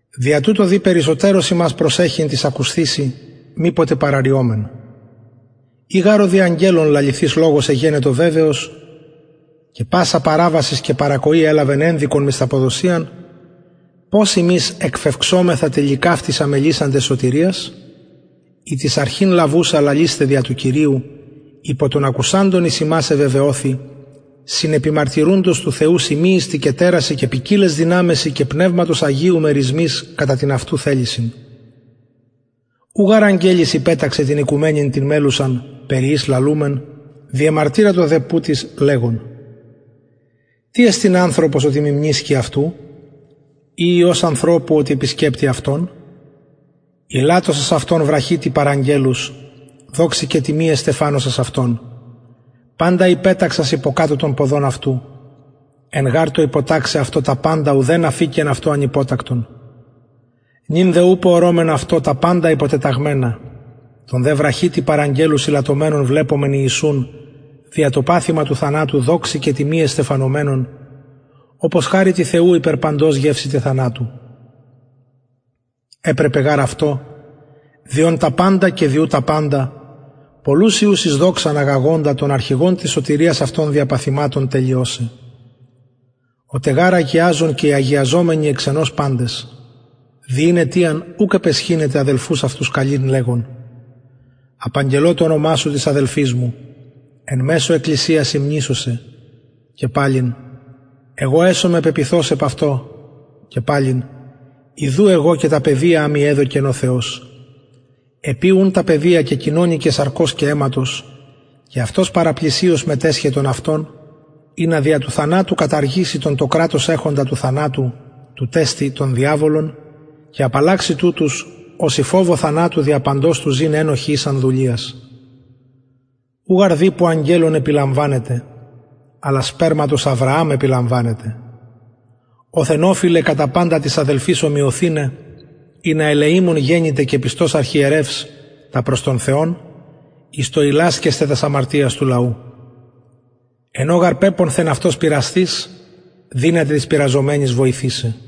δια τουτο δει περισσοτερως ημας προσεχειν τοις ακουσθεισιν μηποτε παραρρυωμεν ει γαρ ο δι αγγελων λαληθεις λογος εγενετο βεβαιος και πασα παραβασις και παρακοη ελαβεν ενδικον μισθαποδοσιαν πως ημεις εκφευξομεθα τηλικαυτης αμελησαντες σωτηριας ητις αρχην λαβουσα λαλεισθαι δια του κυριου υπο των ακουσαντων εις ημας εβεβαιωθη συνεπιμαρτυρουντος του θεου σημειοις τε και τερασιν και ποικιλαις δυναμεσιν και πνευματος αγιου μερισμοις κατα την αυτου θελησιν ου γαρ αγγελοις υπεταξεν την οικουμενην την μελλουσαν περι ης λαλουμεν διεμαρτυρατο δε που τις λεγων τι εστιν ανθρωπος οτι μιμνησκη αυτου η υιος ανθρωπου οτι επισκεπτη αυτον ηλαττωσας αυτον βραχυ τι παρ αγγελους δοξη και τιμη εστεφανωσας αυτον παντα υπεταξας υποκατω των ποδων αυτου εν γαρ τω υποταξαι αυτω τα παντα ουδεν αφηκεν αυτω ανυποτακτον νυν δε ουπω ορωμεν αυτω τα παντα υποτεταγμενα τον δε βραχυ τι παρ αγγελους ηλαττωμενον βλεπομεν ιησουν δια το παθημα του θανατου δοξη και τιμη εστεφανωμενον οπως χαριτι θεου υπερ παντος γευσηται θανατου επρεπεν γαρ αυτω δι ον τα παντα και δι ου τα παντα πολλους υιους εις δοξαν αγαγοντα τον αρχηγον της σωτηριας αυτων δια παθηματων τελειωσαι ο τε γαρ αγιαζων και οι αγιαζομενοι εξ ενος παντες δι ην αιτιαν ουκ επαισχυνεται αδελφους αυτους καλειν λεγων απαγγελω το ονομα σου τοις αδελφοις μου εν μεσω εκκλησιας υμνησω σε και παλιν εγω εσομαι πεποιθως επ αυτω και παλιν ιδου εγω και τα παιδια α μοι εδωκεν ο θεος επει ουν τα παιδια κεκοινωνηκεν σαρκος και αιματος και αυτος παραπλησιως μετεσχεν των αυτων ινα δια του θανατου καταργηση τον το κρατος εχοντα του θανατου τουτ εστιν τον διαβολον και απαλλαξη τουτους οσοι φοβω θανατου δια παντος του ζην ενοχοι ησαν δουλειας ου γαρ δηπου αγγελων επιλαμβανεται αλλα σπερματος αβρααμ επιλαμβανεται οθεν ωφειλεν κατα παντα τοις αδελφοις ομοιωθηναι ινα ελεημων γενηται και πιστος αρχιερευς τα προς τον θεον εις το ιλασκεσθαι τας αμαρτιας του λαου εν ω γαρ πεπονθεν αυτος πειρασθεις δυναται τοις πειραζομενοις βοηθησαι